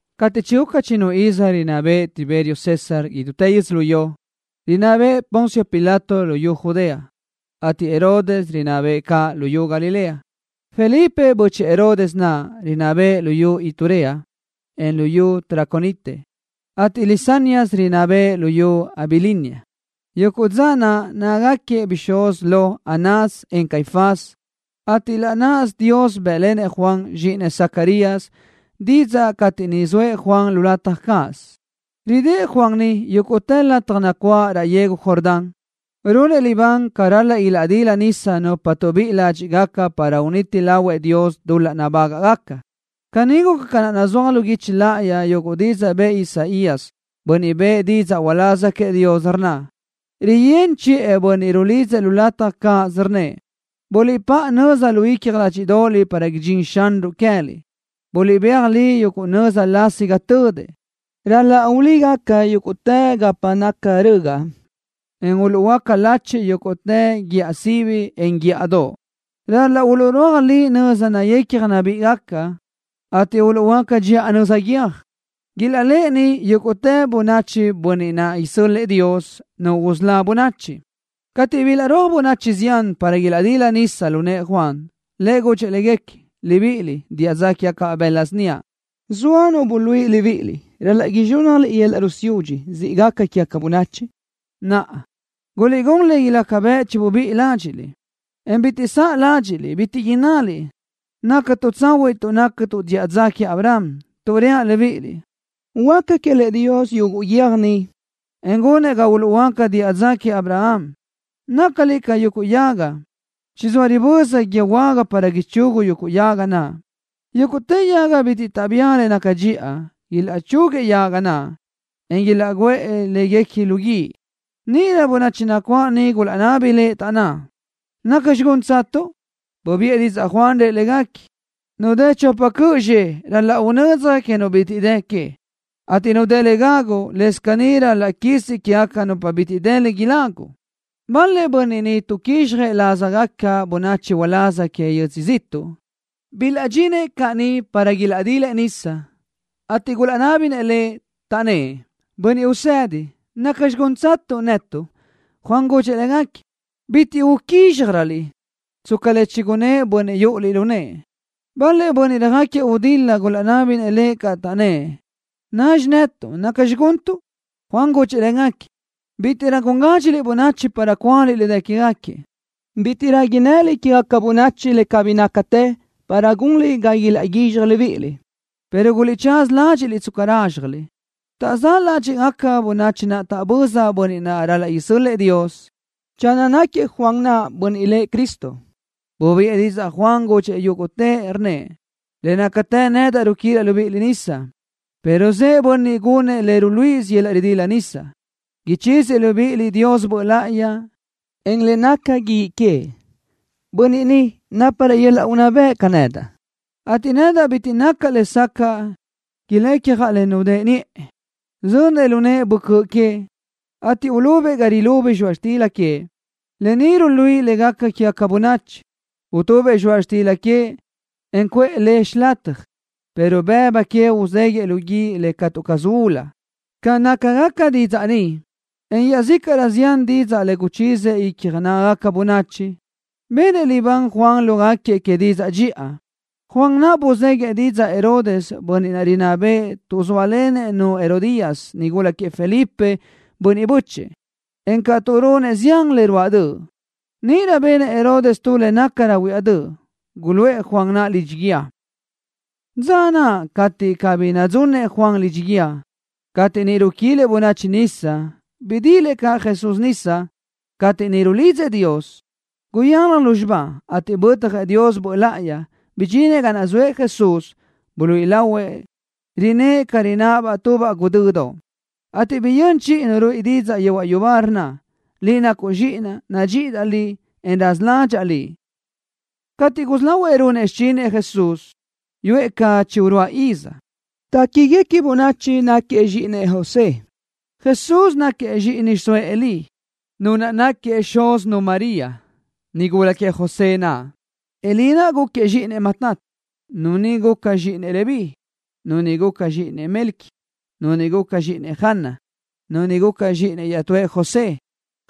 Cateʼ chiguca chinu iz rinná béʼenëʼ Tiberio César idútë yödzölió, rinná bëʼë Poncio Pilato luyú Judea, ateʼ Herodes rinná bëʼë caʼ luyú Galilea. Felipe, bö́chëʼë Herodes naʼ, rinná bëʼë luyú Iturea, en luyú Traconite, ateʼ Lisanias rinná bëʼë luyú Abilinia. Yuguʼ dza naʼ nácagaquiëʼ bixúz lo Anás, en Caifás, ateʼ laʼ náʼasö Dios bë́ʼlenëʼ Juan, zxíʼinëʼ Zacarías, didzaʼ cateʼ niʼ zoëʼ Juan lu lataj cáʼasö. Ridë́ʼ Juan ni yúguʼtë lataj nacuáʼ raʼ yegu Jordán, runëʼ libán ca ral-laʼ ilaʼdila nisa nupa tuʼbíʼi ládxiʼgaca para uniti lahuëʼ Dios dul-laʼ nabágaʼgaca. Guca caní ca naʼ nazúaj lu guichi láʼayi yuguʼ didzaʼ bëʼë Isaías, bönniʼ bëʼë didzaʼ uláz queëʼ Dios, rnna: Riyö́n chiʼë bönniʼ rulidzëʼ lu lataj cáʼasö, rnnëʼ: “Buliʼpáʼa nöza lu icja ládxidoʼoliʼ para idxín Xanruʼ queë́liʼ. Buliʼbéaj li yuguʼ nöza lasi ga tödëʼ. Ral-laʼ ulígaca yúguʼtë gapa naca rögaʼ, en uluʼhuöáca lachiʼ yúguʼtë guíʼa sibi, en guíʼadoʼ. Ral-laʼ uluʼrúaj li nöza nayecja nabíʼigaca, ateʼ uluʼhuöáca dxiʼa nöza guiö́j. Ilaʼléʼeni yúguʼtë bönachi Bönniʼ naʼ isö́l-lëʼë Dios, Nu usölá bönachi.” Cateʼ bilaʼrúaj bönachi zián para ilaʼdila nisa lu nëʼë Juan, lëʼ gudxëʼ légaquiëʼ: —Libiʼiliʼ, diʼa dza quégacabaʼ bëla síniaʼ. ¿Zoa nu buluíʼi libíʼiliʼ ral-laʼ izxúnnajliʼ yöl-laʼ rusiúdxi siʼ gaca quégaca bönachi? Naʼa, guliʼgún le ilaca bëʼ chibubíʼi ládxiʼliʼ, en bitiʼ saʼ ládxiʼliʼ, bitiʼ innaliʼ: “Nácatuʼ tsahuiʼ tuʼ nácatuʼ diʼa dza queëʼ Abraham”, tuʼ reaʼ libíʼiliʼ, huáca quélëʼë Dios yuguʼ guiö́j ni, en gunëʼ ga uluʼhuöáca diʼa dza queëʼ Abraham. Nácaliʼ ca yuguʼ yaga. Chizóa riböza guíë huága para ichugu yuguʼ yaga. Yúguʼtë yaga bitiʼ taʼbía le naca dxiʼa, ilaʼchúguiëʼ yaga naʼ, en ilaʼguʼë léguequi lu guíʼ. Níʼirö bönachi nacuáʼ niʼ gulaʼnabi lëʼ, taʼnná: —¿Nacxi gúntsatuʼ? Bubiʼë didzaʼ Juan, rëʼ légaquiëʼ: —Nu dë chopa cöʼ zxe ral-laʼ unödzaj que nu bitiʼ dë que, ateʼ nu dë le gagu, lëscaʼ caní ral-laʼ quisi quégaca nupa bitiʼ dë le ilágugaca. Bal-lëʼ bönniʼ tuʼquizxjëʼ lázagaca bönachi uláz que yödzö ziʼtuʼ bilaʼdxinëʼ caʼ niʼ para ilaʼdilëʼ nisa, ateʼ gulaʼnábinëʼ lëʼ, taʼnnë́ʼ: —Bönniʼ usëdi, ¿nacxi gúntsatuʼ netuʼ? Juan gudxëʼ légaquiëʼ: —Bitiʼ uquízxjaröliʼ tsca le chigunnë́ʼ bönniʼ yúʼuliʼ lu nëʼë. Bal-lëʼ bönniʼ röjáquiëʼ gudil-la gulaʼnábinëʼ caʼ lëʼ, taʼnnë́ʼ: —¿Nazxi netuʼ, nacxi guntuʼ? Juan gudxëʼ légaquiëʼ: —Bítiʼrö gun gádxiliʼ bönachi para cúaliʼ le dë quéguequi. Bítiʼrö innëliʼ quégaca bönachi le cabí nácatë para gunliʼ ga ilaʼguizxaj libíʼiliʼ, pero guliʼtsaza ládxiʼliʼ tsca rázxjaliʼ. Taʼzáʼ ládxiʼgaca bönachi naʼ taʼböza Bönniʼ naʼ ral-laʼ isö́l-lëʼë Dios, channö náquiëʼ Juan naʼ Bönniʼ lëʼ Cristo. Bubiʼë didzaʼ Juan, gudxëʼ yúguʼtëʼ, rnnëʼ: —Le nácatë nedaʼ ruquilaʼ libíʼiliʼ nisa, pero zëʼë Bönniʼ gunëʼ le ruluíʼisö yöl-laʼ ridila nisa ni, ichíziëʼ libíʼiliʼ Dios Böʼ Láʼayi, en le naca guíʼ queëʼ. Bönniʼ ni náparëʼ yöl-laʼ unná bëʼ ca nedaʼ, ateʼ nedaʼ bitiʼ nacaʼ lesacaʼ ilecjaʼ le nudë́ʼë niʼe. Zönëʼ lu nëʼë böcö́ʼ queëʼ, ateʼ ulubëʼ ga rilubi zxoaʼ xtila queëʼ, lë ni ruluíʼi le gaca quégaca bönachi. Utubëʼ zxoaʼ xtila, en cuʼë le xilataj, pero bëbu que uzéguiʼë lu guíʼ le catu caz ulu. Ca nácagaca didzaʼ ni, en iaʼzícaʼrö zián didzaʼ le guchíziëʼ icja nágagaca bönachi, benëʼ libán Juan lógaquiëʼ que didzaʼ dxiʼa. Juan naʼ buzéguiʼë didzaʼ Herodes, bönniʼ rinná bëʼë, tuʼ zóalenëʼ-nu Herodías, nigula queëʼ Felipe, bönniʼ bö́chëʼë, encaʼ tuʼ runëʼ zián le ruáʼ döʼ. Níʼirö benëʼ Herodes tu le nácarö huiáʼ döʼ, guluʼë Juan naʼ lidxi guíë. Dza naʼ cateʼ cabí nadzunëʼ Juan lidxi guíë, cateʼ niʼ ruquilëʼ bönachi nisa, bidilëʼ caʼ Jesús nisa. Cateʼ niʼ rulidzëʼ Dios, guyalaj lúzxiba, ateʼ bötjëʼ Dios Böʼ Láʼayi, bidxinëʼ ga naʼ zoëʼ Jesús. Buluíʼi lahuëʼ, rinë́ʼë ca rináʼ tubaʼ guʼdödoʼ, ateʼ biyö́n chiʼi Nu ruíʼi didzaʼ yehuaʼ yubá, rnna: —Liʼ nacuʼ Zxíʼinaʼ. Nadxíʼidaʼ Liʼ, en raza ládxaʼa Liʼ. Cateʼ gusí lahuëʼ runëʼ xichinëʼ Jesús, yuʼë ca chi uruáʼ iz. Téquiguequi bönachi náquiëʼ zxíʼinëʼ José. Jesús náquiëʼ zxíʼini xiʼsóëʼ Elí, nu naʼ náquiëʼ xúzinu María, nigula queëʼ José naʼ. Elí naʼ gúquiëʼ zxíʼinëʼ Matat, nu ni guca zxíʼinëʼ Leví, nu ni guca zxíʼinëʼ Melqui, nu ni guca zxíʼinëʼ Jana, nu ni guca zxíʼinëʼ iaʼtúëʼ José.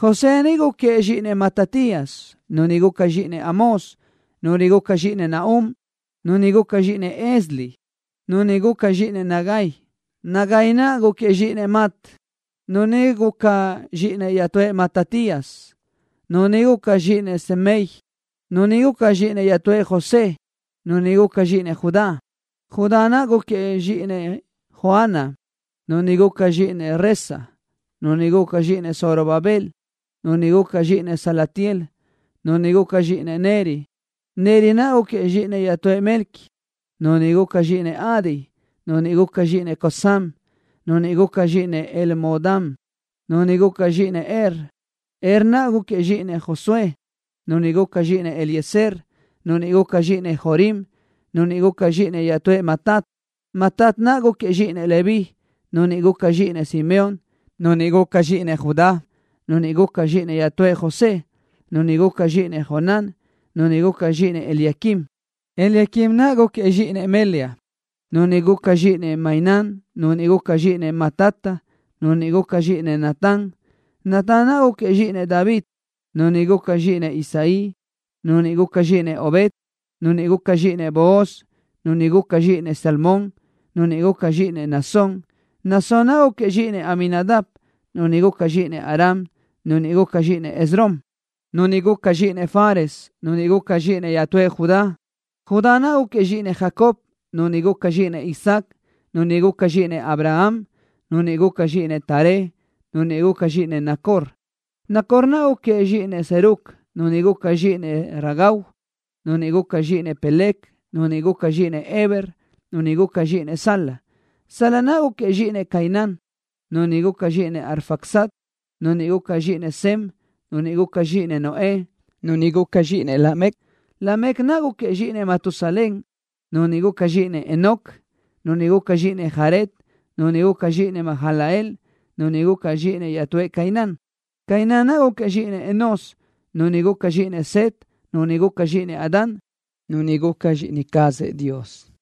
José ni gúquiëʼ zxíʼinëʼ Matatías, nu ni guca zxíʼinëʼ Amós, nu ni guca zxíʼinëʼ Nahum, nu ni guca zxíʼinëʼ Esli, nu ni guca zxíʼinëʼ Nagai. Nagai naʼ gúquiëʼ zxíʼinëʼ Mat, nu ni guca zxíʼinëʼ iaʼtúëʼ Matatías, nu ni guca zxíʼinëʼ Semei, nu ni guca zxíʼinëʼ iaʼtúëʼ José, nu ni guca zxíʼinëʼ Judá. Judá naʼ gúquiëʼ zxíʼinëʼ Joana, nu ni guca zxíʼinëʼ Resa, nu ni guca zxíʼinëʼ Zorobabel, nu ni guca zxíʼinëʼ Salatiel, nu ni guca zxíʼinëʼ Neri. Neri naʼ gúquiëʼ zxíʼinëʼ iaʼtúëʼ Melqui, nu ni guca zxíʼinëʼ Adi, nu ni guca zxíʼinëʼ Cosam, nu ni guca zxíʼinëʼ Elmodam, nu ni guca zxíʼinëʼ Er. Er naʼ gúquiëʼ zxíʼinëʼ Josué, nu ni guca zxíʼinëʼ Eliezer, nu ni guca zxíʼinëʼ Jorim, nu ni guca zxíʼinëʼ iaʼtúëʼ Matat. Matat naʼ gúquiëʼ zxíʼinëʼ Leví, nu ni guca zxíʼinëʼ Simeón, nu ni guca zxíʼinëʼ Judá, nu ni guca zxíʼinëʼ iaʼtúëʼ José, nu ni guca zxíʼinëʼ Jonán, nu ni guca zxíʼinëʼ Eliaquim. Eliaquim naʼ gúquiëʼ zxíʼinëʼ Melea, nu ni guca zxíʼinëʼ Mainán, nu ni guca zxíʼinëʼ Matata, nu ni guca zxíʼinëʼ Natán. Natán naʼ gúquiëʼ zxíʼinëʼ David, nu ni guca zxíʼinëʼ Isaí, nu ni guca zxíʼinëʼ Obed, nu ni guca zxíʼinëʼ Booz, nu ni guca zxíʼinëʼ Salmón, nu ni guca zxíʼinëʼ Naasón. Naasón naʼ gúquiëʼ zxíʼinëʼ Aminadab, nu ni guca zxíʼinëʼ Aram, nu ni guca zxíʼinëʼ Esrom, nu ni guca zxíʼinëʼ Fares, nu ni guca zxíʼinëʼ iaʼtúëʼ Judá. Judá naʼ gúquiëʼ zxíʼinëʼ Jacob, nu ni guca zxíʼinëʼ Isaac, nu ni guca zxíʼinëʼ Abraham, nu ni guca zxíʼinëʼ Taré, nu ni guca zxíʼinëʼ Nacor. Nacor naʼ gúquiëʼ zxíʼinëʼ Serug, nu ni guca zxíʼinëʼ Ragau, nu ni guca zxíʼinëʼ Peleg, nu ni guca zxíʼinëʼ Heber, nu ni guca zxíʼinëʼ Sala. Sala naʼ gúquiëʼ zxíʼinëʼ Cainán, nu ni guca zxíʼinëʼ Arfaxad, nu ni guca zxíʼinëʼ Sem, nu ni guca zxíʼinëʼ Noé, nu ni guca zxíʼinëʼ Lamec. Lamec naʼ gúquiëʼ zxíʼinëʼ Matusalén, nu ni guca zxíʼinëʼ Enoc, nu ni guca zxíʼinëʼ Jared, nu ni guca zxíʼinëʼ Mahalalel, nu ni guca zxíʼinëʼ iaʼtúëʼ Cainán. Cainán naʼ gúquiëʼ zxíʼinëʼ Enós, nu ni guca zxíʼinëʼ Set, nu ni guca zxíʼinëʼ Adán, nu ni guca ca zxíʼini cazëʼ Dios.